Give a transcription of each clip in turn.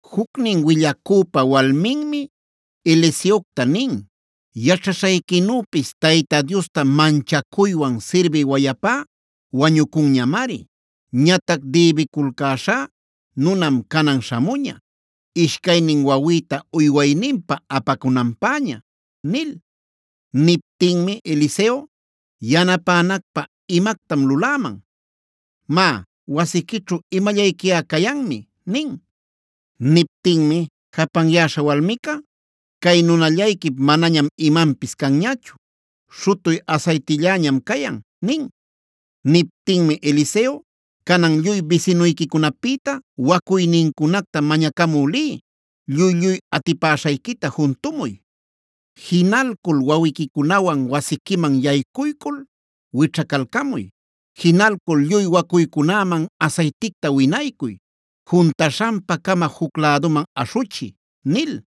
Jucnin willacüpa walminmi Eliseocta nin: “Yaćhaśhayquinüpis Tayta Diosta manchacuywan sirbï wayapá wañucunñamari. Ñatac dïbiculcäśhá nunam canan śhamuña ishcaynin wawïta uywayninpä apacunanpäña” nil. Niptinmi Eliseo: “¿Yanapänacpä imactam luläman? Má, wasiquićhu imallayquiꞌa cayanmi” nin. Niptinmi japanyäśha walmica: “Cay nunallayquip manañam imanpis canñachu. Śhutuy asaytilläñam cayan” nin. Niptinmi Eliseo: “Canan lluy bisinuyquicunapïta wacuynincunacta mañacamü liy. ¡Lluy-lluy atipäshayquita juntumuy! Jinalcul wawiquicunawan wasiquiman yaycuycul wićhacalcamuy. Jinalcul lluy wacuycunäman asayticta winaycuy; juntaśhanpa-cama juc läduman aśhuchiy” nil.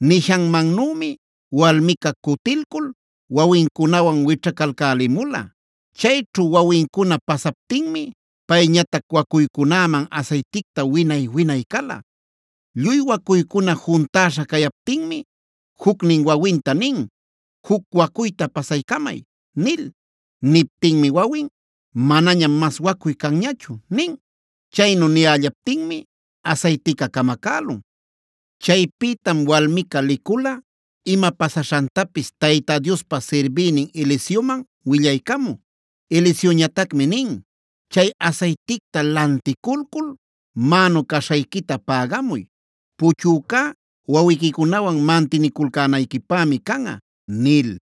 Nishanmannümi walmica cutilcul wawincunawan wićhacalcälimula. Chayćhu wawincuna pasaptinmi payñatac wacuycunäman asayticta winay-winay cala. Lluy wacuycuna juntäśha cayaptinmi jucnin wawinta nin: “Juc wacuyta pasaycamay” nil. Niptinmi wawin: “Manañam mas wacuy canñachu” nin. Chaynu niyällaptinmi asaytica camacälun. Chaypïtam walmica licula ima pasaśhantapis Tayta Diospa sirbïnin Eliseoman willaycamü. Eliseoñatacmi nin: “Chay asayticta lanticulcul mänu caśhayquita pägamuy. Puchücá wawiquicunawan mantiniculcänayquipämi canꞌa” nil.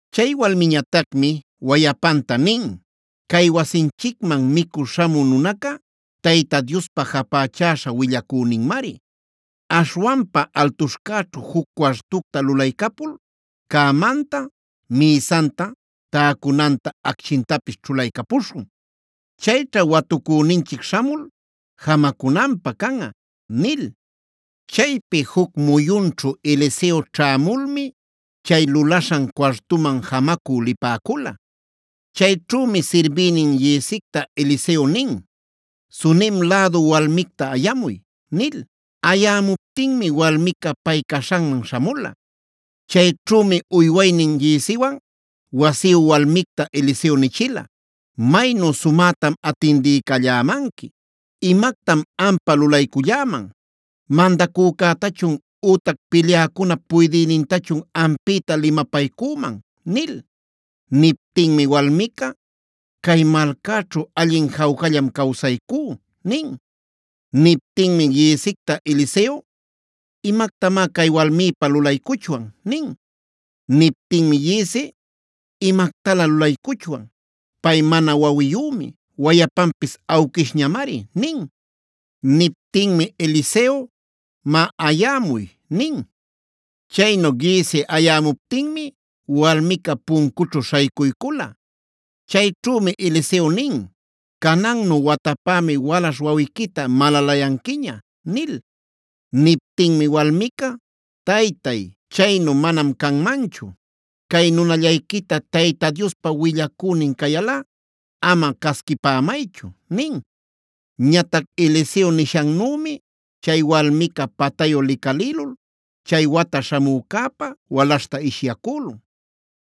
Chay walmiñatacmi wayapanta nin: “Cay wasinchicman micü śhamü nunaca Tayta Diospa japächäśha willacüninmari. Aśhwanpa altuśhcäćhu juc cuartucta lulaycapul cämanta, mïsanta, täcunanta, acchintapis ćhulaycapuśhun. Chayćha watucüninchic śhamul jamacunanpä canꞌa” nil. Chaypi juc muyunćhu Eliseo ćhämulmi chay lulaśhan cuartuman jamacü lipäcula. Chayćhümi sirbïnin Giezicta Eliseo nin: “Sunem lädu walmicta ayamuy” nil. Ayämuptinmi walmica pay caśhanman śhamula. Chayćhümi uywaynin Gieziwan wasiyu walmicta Eliseo nichila: “Maynu sumätam atindiycallämanqui. ¿Imactam ampä lulayculläman? ¿Mandacücätachun ütac pilyäcunap puydïnintachun ampïta limapaycüman?” nil. Niptinmi walmica: “Cay malcäćhu allin jawcallam cawsaycú” nin. Niptinmi Giezicta Eliseo: “¿Imactamá cay walmipä lulaycuchwan?” nin. Niptinmi Giezi: “Imactalä lulaycuchwan. Pay mana wawiyümi; wayapanpis awquishñamari” nin. Niptinmi Eliseo: “Má, ayämuy” nin. Chaynu Giezi ayämuptinmi walmica puncućhu śhaycuycula. Chayćhümi Eliseo nin: “Canannu watapämi walaśh wawiquita malalayanquiña” nil. Niptinmi walmica: “Taytay, chaynu manam canmanchu. Cay nunallayquita Tayta Diospa willacünin cayalꞌa ama casquipämaychu” nin. Ñatac Eliseo nishannümi chay walmica patayu licalïlul chay wata śhamücäpä walaśhta ishyacülun.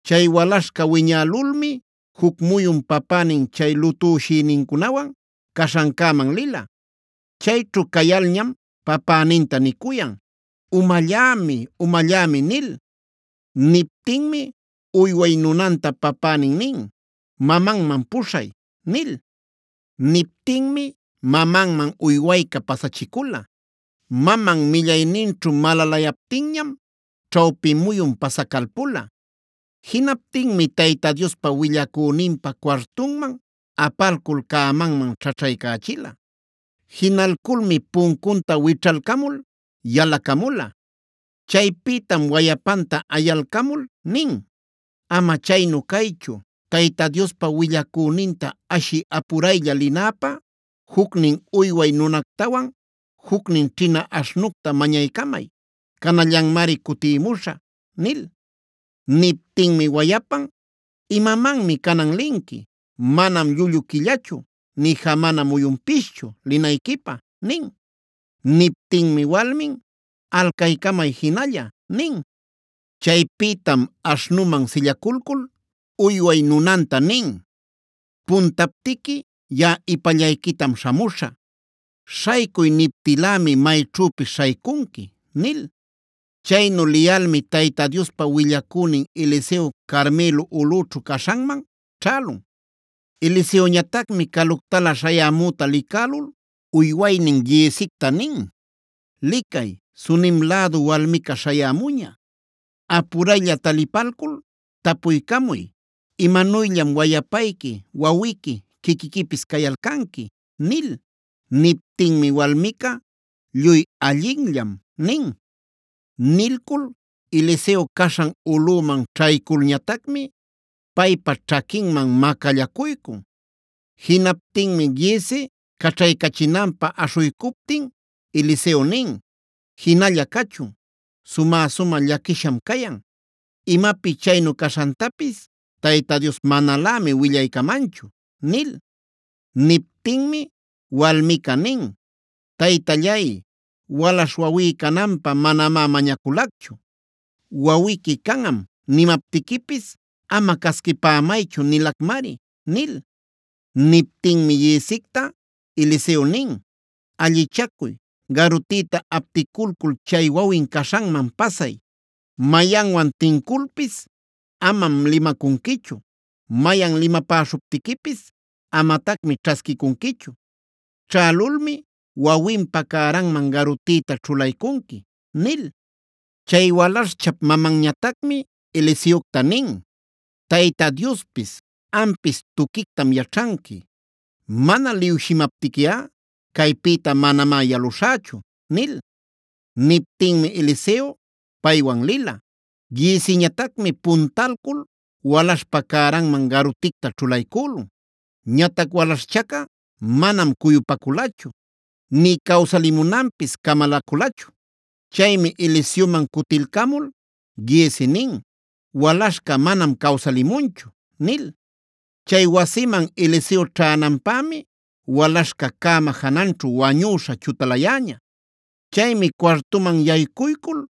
Chay walaśhca wiñälulmi juc muyun papänin chay lutüshïnincunawan caśhancäman lila. Chayćhu cayalñam päpäninta nicuyan: “¡Umallämi! ¡Umallämi!” nil. Niptinmi uyway nunanta papänin nin: “Mamanman puśhay” nil. Niptinmi mamanman uywayca pasachicula. Maman millayninćhu malalayaptinñam ćhawpi muyun pasacalpula. Jinaptinmi Tayta Diospa willacüninpa cuartunman apalcul cämanman ćhaćhaycächila. Jinalculmi puncunta wićhalcamul yalacamula. Chaypïtam wayapanta ayalcamul nin: “Ama chaynu caychu, Tayta Diospa willacüninta ashï apuraylla linäpä jucnin uyway nunactawan jucnin ćhina aśhnucta mañaycamay. Canallanmari cutïmuśhä” nil. Niptinmi wayapan: “¿Imamanmi canan linqui? Manam llullu quillachu, nï jamana muyunpischu linayquipä” nin. Niptinmi walmin: “Alcaycamay jinalla” nin. Chaypïtam aśhnuman sillaculcul uyway nunanta nin: “Puntaptiqui yaꞌa ipallayquitam śhamuśhä. Śhaycuy niptïlämi mayćhüpis śhaycunqui” nil. Chaynu liyalmi Tayta Diospa willacünin Eliseo Carmelo ulꞌućhu caśhanman ćhälun. Eliseoñatacmi caluctalä śhayämüta licälul uywaynin Giezicta nin: “Licay, Sunem lädu walmica śhayämuña. Apuraylla talipalcul tapuycamuy: ‘¿Imanuyllam wayapayqui, wawiqui, quiquiquipis cayalcanqui?’” nil. Niptinmi walmica: “Lluy allinllam” nin. Nilcul Eliseo caśhan ulꞌuman ćhayculñatacmi paypa ćhaquinman macallacuycun. Jinaptinmi Giezi caćhaycachinanpä aśhuycuptin Eliseo nin: “Jinalla cachun, sumä-sumä llaquisham cayan. Imapi chaynu caśhantapis Tayta Dios manalämi willaycamanchu” nil. Niptinmi walmica nin: “Taytallay, walaśh wawí cananpä manamá mañaculacchu. ‘Wawiqui canꞌam’ nimaptiquipis ‘ama casquipämaychu’ nilacmari” nil. Niptinmi Giezicta Eliseo nin: “Allichacuy, garutïta apticulcul chay wawin caśhanman pasay. Mayanwan tinculpis amam limacunquichu. Mayan limapäcuśhuptiquipis amatacmi ćhasquicunquichu. Ćhälulmi wawinpa cäranman garutïta ćhulaycunqui” nil. Chay walaśhchap mamanñatacmi Eliseocta nin: “Tayta Diospis ampis tuquictam yaćhanqui. Mana liwshimaptiquiꞌa caypïta manamá yaluśhächu” nil. Niptinmi Eliseo paywan lila. Gieziñatacmi puntalcul walaśhpa cäranman garuticta ćhulaycülun. Ñatac walaśhchaca manam cuyupaculachu nï cawsalimunanpis camalaculachu. Chaymi Eliseoman cutilcamul Giezi nin: “Walaśhca manam cawsalimunchu” nil. Chay wasiman Eliseo ćhänanpämi walaśhca cäma jananćhu wañüśha chutalayäña. Chaymi cuartuman yaycuycul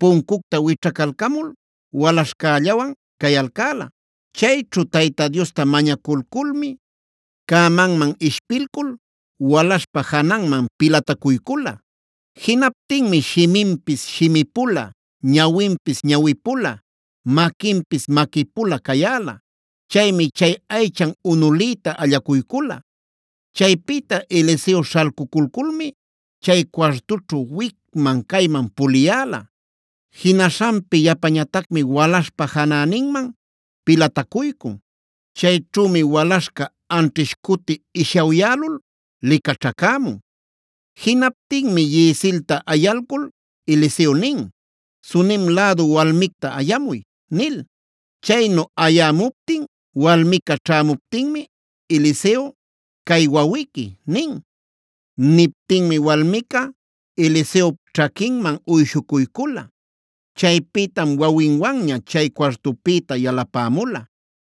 puncucta wićhacalcamul walaśhcällawan cayalcäla. Chayćhu Tayta Diosta mañaculculmi, cämaman ishpilcul walaśhpa jananman pilatacuycula. Jinaptinmi shiminpis shimipula, ñawinpis ñawipula, maquinpis maquipula cayäla. Chaymi chay aychan unuliyta allacuycula. Chaypïta Eliseo śhalcuculculmi chay cuartućhu wicman-cayman puliyäla. Jinaśhanpi yapañatacmi walaśhpa janäninman pilatacuycun. Chayćhümi walaśhca anćhish cuti ishawyälul licaćhacämun. Jinaptinmi Giezilta ayalcul Eliseo nin: “Sunem lädu walmicta ayamuy” nil. Chaynu ayämuptin walmica ćhamuptinmi Eliseo: “Cay wawiqui” nin. Niptinmi walmica Eliseop ćhaquinman uyshucuycula. Chaypïtam wawinwanña chay cuartupïta yalapämula.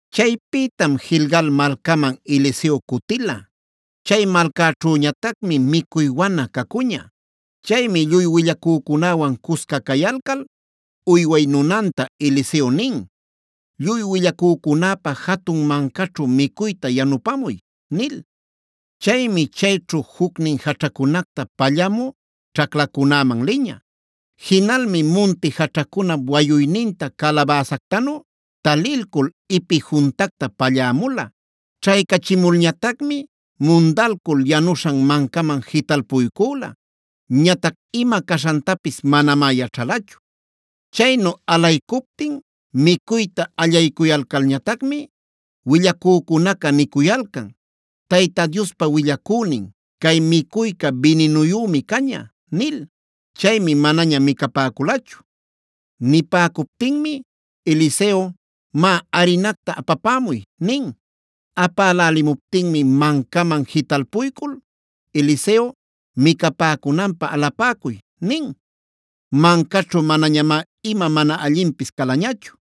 Chaypïtam Gilgal malcaman Eliseo cutila. Chay malcaćhüñatacmi micuy wana cacuña. Chaymi lluy willacücunäwan cusca cayalcal uyway nunanta Eliseo nin: “Lluy willacücunäpa jatun mancaćhu micuyta yanupamuy” nil. Chaymi chayćhu jucnin jaćhacunacta pallamü ćhaclacunäman liña. Jinalmi munti jaćhacunap wayuyninta calabäsactanu talilcul ipi juntacta pallämula. Ćhaycachimulñatacmi mundalcul yanuśhan mancaman jitalpuycüla; ñatac ima caśhantapis manamá yaćhalachu. Chaynu alaycuptin micuyta allaycuyalcalñatacmi willacücunaca nicuyalcan: “Tayta Diospa willacünin, cay micuyca bininuyümi caña” nil. Chaymi manaña micapäculachu. Nipäcuptinmi Eliseo: “Má, arinacta apapämuy” nin. Apälälimuptinmi mancaman jitalpuycul Eliseo: “Micapäcunanpä alapäcuy” nin. Mancaćhu manañamá ima mana allinpis calañachu.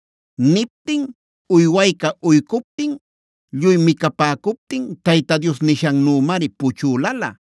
Niptin uywayca uycuptin lluy micapäcuptin Tayta Dios nishannümari puchülalä.